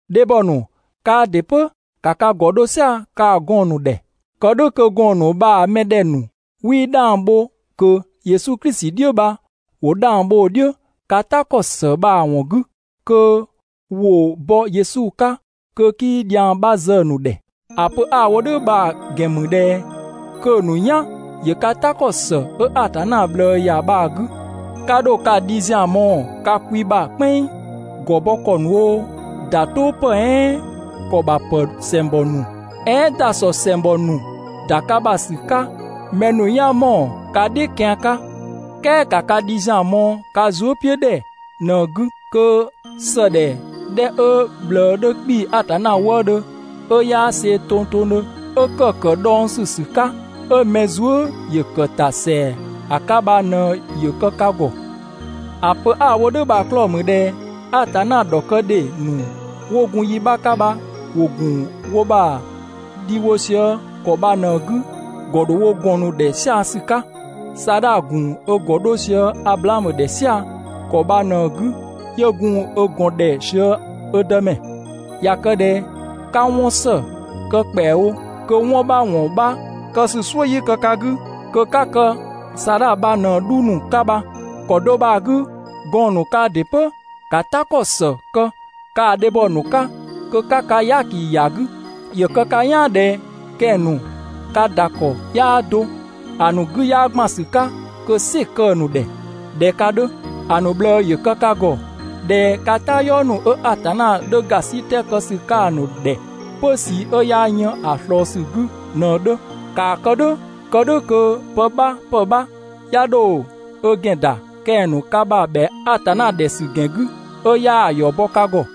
Dhebhɔ ‑nu, kaa ‑dɩ 'pö ‑ka ka ‑gɔ 'dho "sia‑ kaa‑ gɔɔn‑ ‑nu ‑dhɛ, kë "dhʋ̈ kö gɔɔn‑ ‑nu bha‑ mɛ 'dhɛ 'wii 'dhang bho ꞊kö Yesu Klisi "dhiʋ̈ bha ‑wo 'dhang bho‑ "dhiʋ̈ ka "ta ‑kɔ ‑së bha‑ ‑wɔn 'gü kö ‑wo bɔ Yesu 'ka kö 'kii dhiang 'bha zë‑ ‑nu ‑dhɛ. ‑A pö 'a‑ wo "dhʋ̈ bha‑ ‑gɛn ‑mü ꞊dhɛ kö‑ ‑nu "yan ‑yö ka "ta ‑kɔ ‑së 'ö Atanna ꞊bhlëë ‑ya bha‑ 'gü. 'Ka 'dho ka dhi ‑zian mɔɔ‑ ka kwi ‑bha "kpɛnng, ‑gɔ bɔ ‑kɔ ‑nu oo, ‑da "tʋʋ ‑pë "ɛɛn ‑kɔ ‑bha ‑pë ‑sɛngbɔ ‑nu, "ɛɛn ‑dasɔ ‑sɛngbɔ ‑nu ‑da ka ‑bha ‑sü 'ka mɛ ‑nu "yan ‑mɔɔ ka "dhiʋ̈ kian 'ka. "Kɛɛ ‑ka ka dhi ‑zian mɔɔ‑ ka zuëpiʋ̈dhɛ ꞊në‑ 'gü, kö ‑sëdhɛ 'dhɛ 'ö‑ ꞊bhlëë 'dhö 'kpii‑ Atanna wëëdhö, 'ö 'yaa see‑ tongtongdhö 'ö ‑kë ‑kë dhɔngsü ‑sü 'ka, 'ö mɛ zuë" ‑yö ‑kë ‑ta ‑sɛa ‑a 'ka bha ꞊në ‑yö kë ka ‑gɔ. ‑A pö 'a‑ wo "dhʋ̈ bha‑ 'klɔɔ‑ ‑mü ꞊dhɛ Atanna ‑dhɔkëdhe ‑nu 'wo gun yi 'bha 'ka bha ‑wo ‑gun wo ‑bha dhi wo sië ‑kɔ bha ꞊në‑ 'gü, ‑gɔ ‑dho wo ‑gɔn ‑nu ‑dhɛ "sia‑ ‑sü 'ka. Saadha ‑gun ö ‑gɔ 'dho sië Ablaamö ‑dhɛ "sia‑ ‑kɔ bha ꞊në‑ 'gü 'yö gun ö ‑gɔn ‑dhɛ sië ö dëmɛ. ꞊Ya kë ꞊dhɛ 'ka 'wɔn ‑së kë ‑kpɛawo kö 'wɔn 'bha ‑wɔn 'bha kë ‑sü "suʋ̈ 'yii kë ka 'gü, kö 'ka kë Saadha bha ꞊në‑ 'dhu ‑nu 'ka bha. ‑Kɔ do bha‑ 'gü gɔɔn‑ ‑nu kaa ‑dɩ 'pö ‑ka "ta ‑kɔ ‑së kë kaa‑ dhebhɔ ‑nu 'ka kö 'ka ka "yaaki ‑ya 'gü, ‑yö kë ka "yaan ꞊dhɛ kɛng‑ ‑nu ka ‑da ‑kɔ 'yaa do, ‑a ‑nu 'gü 'yaa ‑gban ‑sü 'ka kö "sɩ‑ kë‑ ‑nu ‑dhɛ ꞊dhɛ ka 'dhö. ‑A ‑nu ꞊bhlëë ‑yö kë ka ‑gɔ ꞊dhɛ ka "tayɔɔ ‑nu 'ö Atanna 'dhö ‑gasitɛ kë ‑sü 'ka‑ ‑nu ‑dhɛ 'pö ꞊sii 'ö 'yaa yën ‑a ꞊slɔɔ ‑sü 'gü ꞊në‑ 'dhö. ‑Kaa kë "dhʋ̈ kë "dhʋ̈ kö pë 'bha ‑pë 'bha 'ya 'dho ö ‑gɛn ‑da kɛng‑ ‑nu ka ‑bha ‑bhɛa Atanna ‑dhɛ ‑sü ‑gɛn 'gü ('ö 'yaa‑ ‑yɔ bɔ ka ‑gɔ).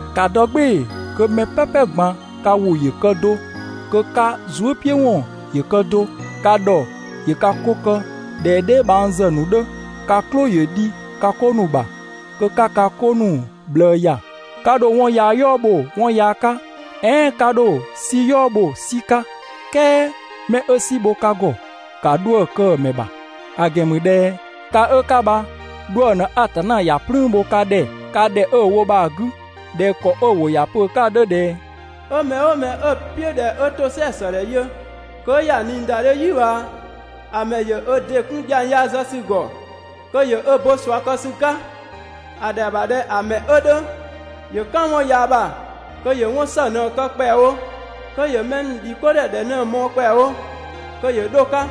‑Ka dɔ "gbɩɩ‑ kö mɛ "pɛpɛ ꞊gban ka ‑wʋ ‑yö kë do, kö ka zuëpiʋ̈wɔn ‑yö kë do, ka ‑dhɔ ‑yö ka 'ko kë ꞊dhɛ dheebhangzë ‑nu 'dhö, ka "klʋ ‑yö dhi ka 'ko ‑nu ‑bha, kö 'ka ka 'ko ‑nu ꞊bhlëë ‑ya. 'Ka 'dho 'wɔn yaa "yɔɔ bho 'wɔn yaa 'ka, "ɛɛn 'ka 'dho "si "yɔɔ bho "si 'ka, "kɛɛ 'mɛ 'ö "si bho ka ‑gɔ, ‑ka 'dhuë‑ kë‑ ‑mɛ ‑bha, ‑a ‑gɛn ‑mü ꞊dhɛ ka 'ö 'ka bha 'dhuë‑ ꞊në Atanna ‑ya "plüün bho ka ‑dhɛ ka ‑dhɛ 'ö‑ wo bha‑ 'gü ꞊dhɛ ‑kɔ 'ö‑ ‑wʋ ‑ya pö‑ 'ka‑ 'dhö ꞊dhɛ: «'Ö mɛ "ʋʋ mɛ 'ö‑ "piʋ̈ ꞊dhɛ 'ö ‑tosɛa ‑së ‑dhɛ yö, kö 'ö ‑ya ꞊niidadhe "yi ꞊bhaa, ‑a ‑mɛ ‑yö ö ‑dɩ 'kun dhiang yaa zë ‑sü ‑gɔ, kö ‑yö ö bo ꞊sua kë ‑sü 'ka. ‑A ‑dhɛa ‑bha ꞊dhɛ ‑a ‑mɛ 'ö 'dhö ‑yö "kan 'wɔn yaa ‑bha kö ‑yö 'wɔn ‑së ꞊në‑ kë ‑kpɛawo, kö ‑yö mɛ ‑nu ‑dhi 'ko ‑dhɛ ‑dhɛ ꞊në‑ mɔɔ‑ ‑kpɛawo kö ‑yö 'dho‑ 'ka.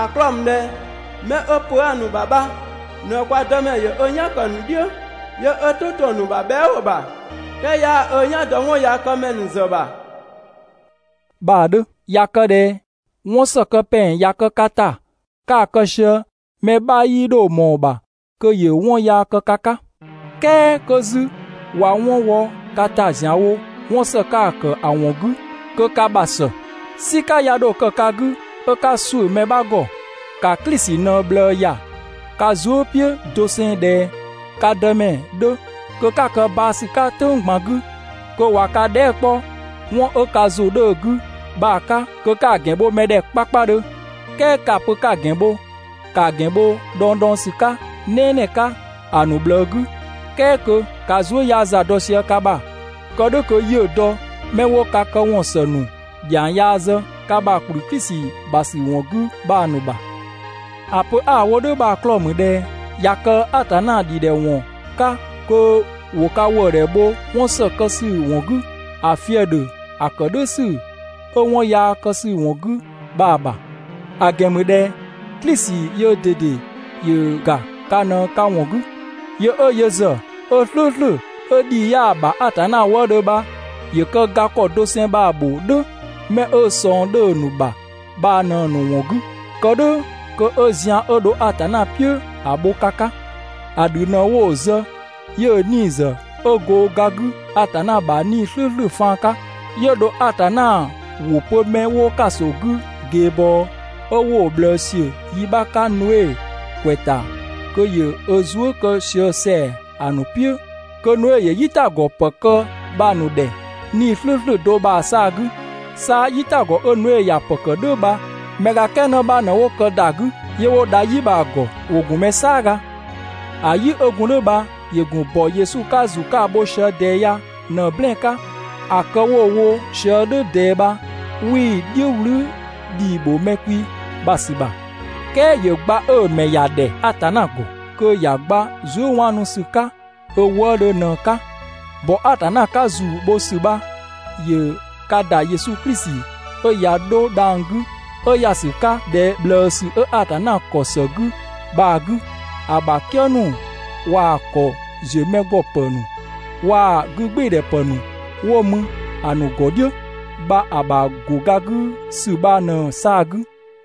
‑A 'klɔɔ‑ ‑mü ꞊dhɛ 'mɛ 'ö pö 'aa‑ ‑nu ‑bha bha ꞊në kwa Dëmɛ ‑yö ö "yan ‑kë ‑nu "dhiʋ̈, 'yö ö "tʋ 'to‑ ‑nu ‑bha bhɛa" ‑wʋ ‑bha, "kɛɛ 'yaa ö "yan dɔ 'wɔnyaakëmɛ ‑nu ‑zë ‑nu ‑bha» bha‑ 'dhö. ꞊Ya kë ꞊dhɛ 'wɔn ‑së kë ‑pɛng ꞊ya kë ka ‑ta 'ka‑ kë sië, mɛ 'bha 'yii 'dho ꞊mɔɔ‑ ‑bha kö ‑yö 'wɔn yaa kë ka 'ka. "Kɛɛ 'kö 'zü ꞊wa 'wɔn wɔ ka ‑ta ‑zianwo 'wɔn ‑së 'ka‑ ‑kë ‑a ‑wɔn 'gü, kö ka ‑bha ‑së. "Sika 'ya 'dho kë ka 'gü 'ö 'ka ‑suʋ̈ mɛ 'bha ‑gɔ. ‑Ka Klisi ꞊në‑ ꞊bhlëë ‑ya ka zuë" "piʋ̈ doseng ꞊dhɛ ka Dëmɛ 'dhö kö 'ka kë baa‑ ‑sü 'ka "tʋ̈ng ꞊gban 'gü kö ꞊wa ka dhɛɛ" 'kpɔ 'wɔn 'ö ka ‑zʋ 'dhö‑ 'gü bha‑ 'ka, kö 'ka‑ ‑gɛn bho‑ ‑mɛ ‑dhɛ 'kpakpadhö. "Kɛɛ 'ka‑ pö 'ka‑ ‑gɛn bho, ‑kaa ‑gɛn bho dhɔngdhɔngsü 'ka "nɛɛnɛɛ 'ka ‑a ‑nu ꞊bhlëë 'gü, "kɛɛ kö ka zuë" 'yaa za dɔ sië ka ‑bha, kë "dhʋ̈ kö 'yiʋ̈‑ dɔ 'mɛ 'wo ka këwɔn ‑së ‑nu ‑dhiang yaa zë ka ‑bha ‑kplü Klisi ‑bha ‑sü ‑wɔn 'gü bha‑ ‑nu ‑bha. ‑A pö 'a‑ wo "dhʋ̈ bha‑ 'klɔɔ‑ ‑mü ꞊dhɛ ꞊ya kë Atanna ‑dhidhɛwɔn 'ka kö ‑wo ka ‑wëëdhɛ bho 'wɔn ‑së kë ‑sü ‑wɔn 'gü, ‑a fië‑ ‑dhö ‑a ‑kë "dhʋ̈ ‑sü 'ö 'wɔn yaa kë ‑sü ‑wɔn 'gü bha‑ ‑bha. ‑A ‑gɛn ‑mü ꞊dhɛ Klisi yöö ꞊dede ‑yö ‑ga ka ꞊në ka ‑wɔn 'gü. Yö 'ö yö ‑zë 'ö "slʋ̈ʋ̈slʋ̈ 'ö ‑dhii 'yaa‑ ‑bha Atanna wëëdhö bha ‑yö kë ga ‑kɔ doseng bha‑ ‑bho "dhʋ̈ 'mɛ 'ö ꞊sɔng 'dhö‑ ‑nu ‑bha bha ꞊në‑ ‑nu ‑wɔn 'gü, kë "dhʋ̈ kö 'ö zian 'ö dho Atanna "piʋ̈ ‑a bho ka 'ka. ‑A ‑dhü ꞊në wo‑ zë 'yö‑ 'nii‑ ‑zë 'ö go ga 'gü Atanna ‑bha 'Nii‑ "slʋ̈ʋ̈slʋ̈ faan 'ka. 'yö dho Atanna ‑wʋ pö 'mɛ 'wo ‑kaso 'gü ꞊geebɔɔ 'ö 'wo‑ ꞊bhlëë ‑siö yi 'bha 'ka Noe ‑kwɛ ‑ta kö ‑yö ö zuë" kë sië ‑sɛa ‑a ‑nu "piʋ̈ kö Noe ‑yö "yitagɔ ‑pë kë bha‑ ‑nu ‑dhɛ 'Nii‑ "slʋ̈ʋ̈slʋ̈ do bha‑ 'saa‑ 'gü. 'Sa "yitagɔ 'ö Noe ‑ya ‑pë ‑kë "dhʋ̈ bha mɛ ga "kɛɛ 'në bha ꞊në 'wo kë ‑da 'gü 'yö 'wo dha "yi bha‑ ‑gɔ. ‑Wo ‑gun mɛ "saaga. ‑A "yi 'ö gun "dhʋ̈ bha ‑yö ‑gun ‑bɔ Yesu 'ka‑ ‑zu 'ka bho sië ꞊dɛɛ ya ꞊në‑ "blɛɛn‑ 'ka. ‑A kë 'wo‑ wo sië "dhʋ̈ ꞊dɛɛ bha 'wii‑ "dhiʋ̈ "wlü ‑dhii ‑bho mɛ kwi ‑bha ‑sü ‑bha, "kɛɛ ‑yö gba 'ö‑ mɛ ‑ya ‑dhɛ Atanna ‑gɔ, kö ‑ya gba zuëwaanusü 'ka ö wëëdhö ꞊në‑ 'ka. ‑Bɔ Atanna 'ka ‑zu bho ‑sü bha ‑yö ka ‑dha Yesu Klisi 'ö ꞊ya 'dho dhang‑ 'gü 'ö ‑ya ‑sü 'ka ‑dhɛ ꞊bhlëësü 'ö Atanna ‑kɔ ‑së 'gü bha‑ 'gü, ‑a ‑bha "kië ‑nu waa‑ ‑kɔ ‑ziö mɛ ‑gɔ ‑pë ‑nu waa‑ 'gügbɩɩdhɛ ‑pë ‑nu 'wo mü ‑a ‑nu ‑gɔ "dhiʋ̈ bha ‑a ‑bha ‑go ga 'gü ‑sü bha ꞊në‑ 'saa‑ 'gü.